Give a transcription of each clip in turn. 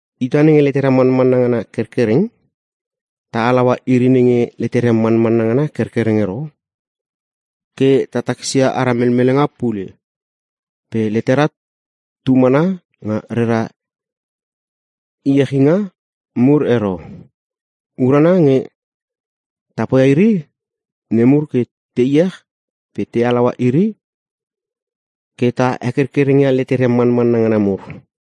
Ita nenge letera manmanna ngana kerkereng, ta halaua iri nenge leteria manmanna ngana kerkereng ero ke ta takisia aria melmelenga pule, pe letera tu mana nga rera iechinga mur ero. Urana nge ta poia iri nemur ke te iech pe ta halaua iri ke ta he kerkerengia leteria manmanna ngana mur.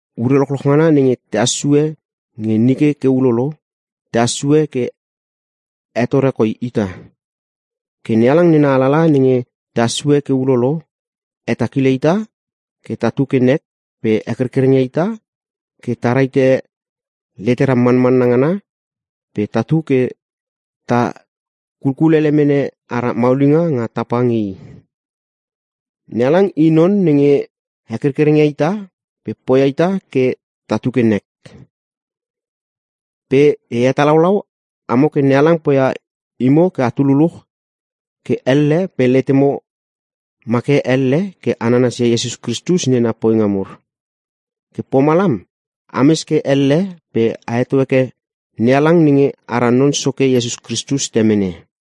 Ure lochloch ngana nenge tehas sue nge nike ke ulolo, tehas sue ke hetore koi ita. Ke NeHalang nena alalaha nenge tehas sue ke ulolo, hetakile ita ke tatu ke nek pe hekerkereng ia ita ke ta rahite letera manmanna ngana pe tatu ke ta kulkulele mene ara maulinga nga tapa nge i. NeHalang i non nenge he kerkereng ia ita pe poia ita ke tatu ke nek. Pe e hetalaulau amo ke NeHalang poia imo ke atu luluch ke elle pe letemo ma ke elle ke a nanasia Iesus Kristus nena poinga mur. Ke pomalam ames ke elle pe a heto heke NeHalang nenge ara Non Soke Iesus Kristus Temene.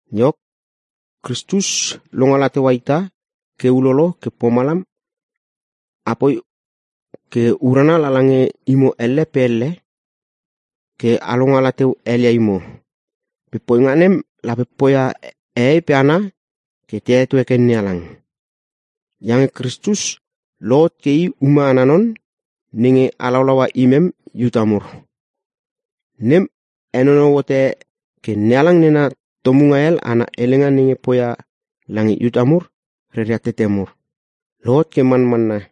Iok, Kristus longala teua ita ke ulolo ke pomalam apoi ke urana lala nge imo elle pe elle ke a longala teu helia imo. Pe poinga nem lape poia hehei pe hana ke te heto heke NeHalang. Iange Kristus lohot ke i ume ana non nenge halaulaua imem Iuta mur. Nem henonou hote ke NeHalang nena tomunga hel ana helenga nenge poia lange Iuta mur reria tete mur, lohot ke manmanna.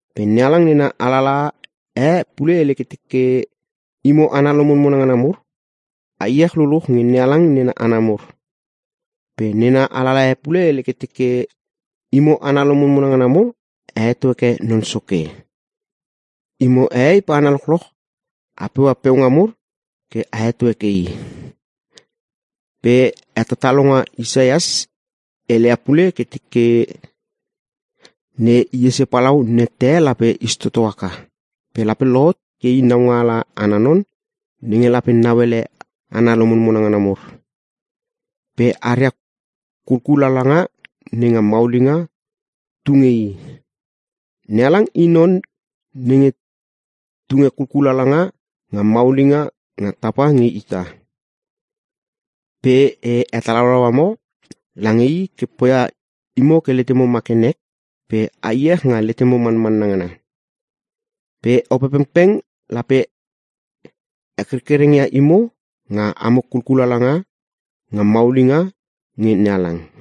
Pe NeHalang nena alalaha e pule hele ke teke, “Imo hana lomonmona ngana mur, a iech luluch nge NeHalang nena hana mur.” Pe nena alalaha e pule hele ke teke, “Imo hana lomonmona ngana mur a heto heke Non Soke. Imo hehei pe hana lochloch, a peua peunga mur ke a heto heke i.” Pe hetatalonga Isaias heleia pule ke teke, “Ne Iese palau nette e lape is toto haka, pe lape lohot ke i naungaala ana non nenge lape nauele hana lomonmona ngana mur. Pe aria kulkulalanga nenga maulinga tu nge i.” NeHalang i non nenge tunge kulkulalanga nga maulinga nga tapa nge ita. Pe e hetalaulau amo lange i ke poia imo ke letemo ma ke nek pe a iech nga letemo manmanna ngana. Pe Opepengpeng lape he kerkereng ia imo nga amo kulkulalanga nga maulinga nge NeHalang.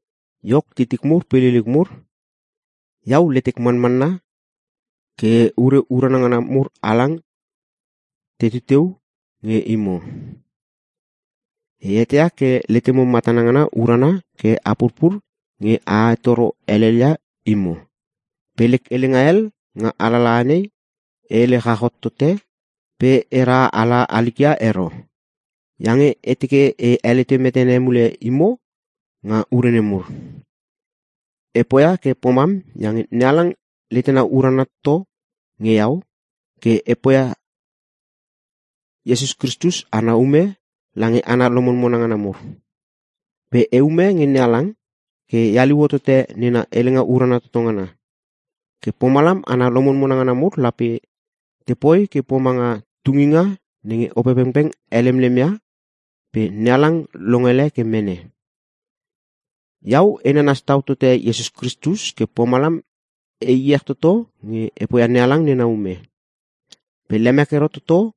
Iok titik mur pe liliuk mur, Iau letek manmanna ke ure urana ngana mur halang tetu teu nge imo. E eteia ke letemo matana ngana urana ke a purpur nge a hetoro helel ia imo. Pe lek helenga hel nga alalaha nei e hele chach hot tote pe era hala halik ia ero, iange e teke e helete metene mule imo nga ure nemur. E poia ke pomam iange NeHalang letena urana toto nge iau ke e poia Iesus Kristus ana ume lange hana lomonmona ngana mur. Pe e ume nge NeHalang ke e haliu hotote nena helenga urana toto ngana. Ke pomalam hana lomonmona ngana mur lape tepoi ke pomanga tunginga nenge Opepengpeng helemlem ia pe NeHalang longele ke mene. Iau e nanas tau tote Iesus Kristus ke pomalam e iech toto nge e poia NeHalang nena ume. Pe lemek ero toto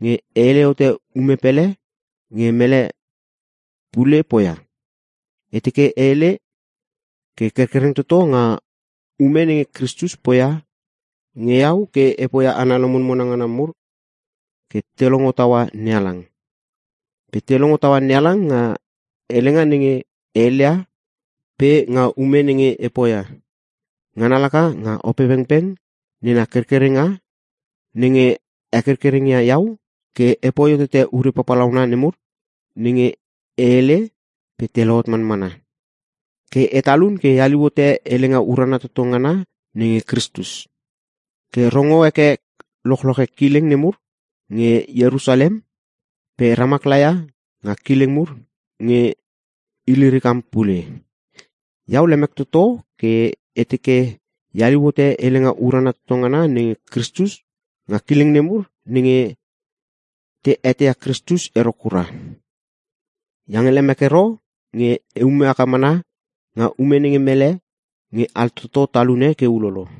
nge e hele hote ume pele nge mele pule poia. E teke e hele ke kerkereng toto nga ume nenge Kristus poia nge iau ke e poia hana lomonmona ngana mur ke te longo taua NeHalang. Pe te longo taua NeHalang nga helenga nenge e heleia pe nga ume nenge e poia. Ngana laka nga Opepengpeng nena kerkerenga nenge he kerkereng ia iau ke epoi hotote ure papalauna nemur nenge e hele pe te lohot manmana. Ke e talun ke e haliu hote helenga urana toto ngana nenge Kristus, ke rongo heke lochloche kileng nemur nge Ierusalem pe ramak laia nga kileng mur nge Ilirikam pule. Iau lemek toto ke e teke e haliu hote helenga urana toto ngana nenge Kristus nga kileng nemur nenge te eteia Kristus ero kura. Iange lemek ero nge e ume haka mana nga ume nenge mele nge altoto talune ke ulolo.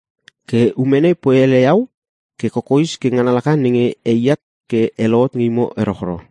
Ke ume nei poi ele iau ke kokoes ke ngana laka nenge eat ke e lohot nge imo erochro.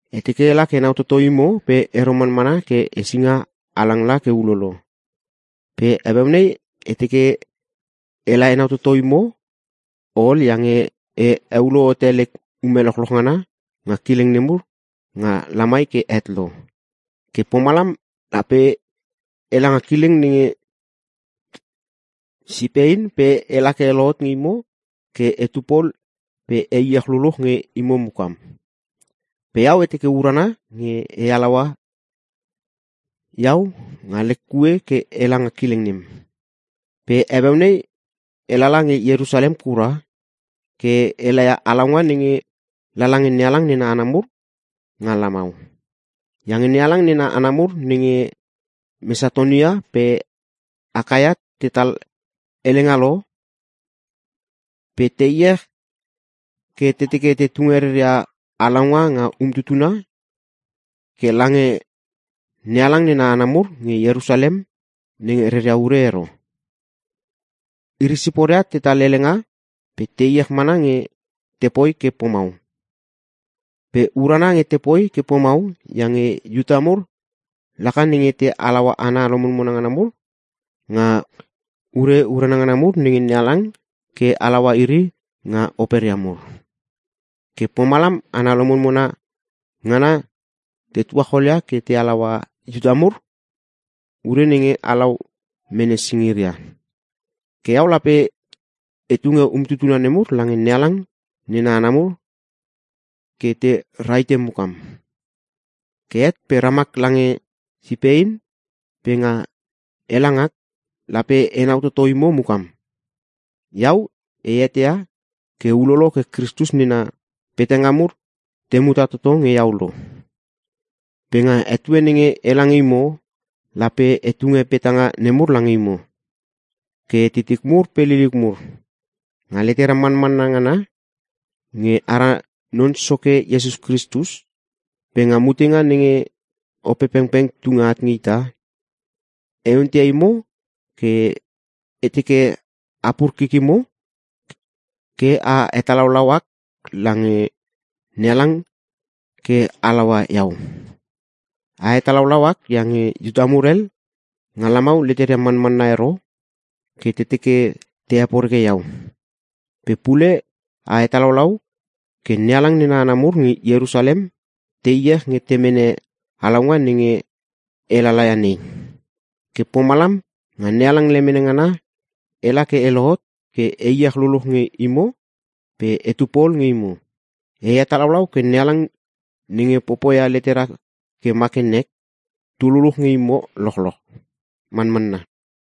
E teke ela ke enau toto imo pe ero manmana ke hesinga halang la ke ulolo. Pe heueu nei e teke ela toto nge imo ol iange e heulo hote lek ume lochloch ngana nga kileng nemur nga lamai ke het lo. Ke pomalam lape ela nga kileng nenge Sipein pe ela ke e lohot nge imo ke etu pol pe e iech luluch nge imo mukam. Pe iau e teke urana nge a halaua iau nga lek kue ke ela nga kileng nem. Pe heueu nei e lala nge Ierusalem kura ke e laia halaunga nenge lala nge NeHalang nena hana mur nga lamau. Iange NeHalang nena hana mur nenge Mesatonia pe Akaia tetal helenga lo pe te iech ke te teke te tunge reria halaunga nga umtutuna ke lange NeHalang nena hana mur nge Ierusalem nenge reria ure ero. Iri siporia tetal helenga pe te iech mana nge tepoi ke pomau. Pe urana nge tepoi ke pomau, iange Iuta mur laka nenge te halaua hana lomonmona ngana mur nga ure urana ngana mur nge NeHalang ke halaua iri nga operia mur. Ke pomalam hana lomonmona ngana te tuacholia ke te halaua Iuta mur nga ure nenge halau mene singiria. Ke iau lape e tunge umtutuna nemur lange NeHalang nena hana mur ke te rahite mukam. Ke het pe ramak lange Sipein pe nga ela ngak, lape enau toto imo mukam. Iau e eteia ke ulolo ke Kristus nena petanga mur te muta toto nge iau lo. Pe nga etue nenge ela nge imo, lape e tunge petanga nemur lange imo. Ke titik mur pe liliuk mur, nga letera manmanna ngana nge ara Non Soke Iesus Kristus pe nga mutenga nenge Opepengpeng tunge at nge ita, e onteia imo ke e teke a pur kikimo ke a hetalaulau ak lange NeHalang ke halaua iau. A hetalaulau ak iange Iuta mur hel nga lamau leteria manmanna ero ke te teke te heporeke iau. Pe pule a hetalaulau ke NeHalang nena hana mur nge Ierusalem te iech nge te mene halaunga nenge e lalaia nei. Ke pomalam nga NeHalang lemene ngana ela ke e lohot ke e iech luluch nge imo pe etu pol nge imo. E hetalaulau ke NeHalang nenge popoia letera ke ma ke nek, tu luluch nge imo lochloch. Manmanna.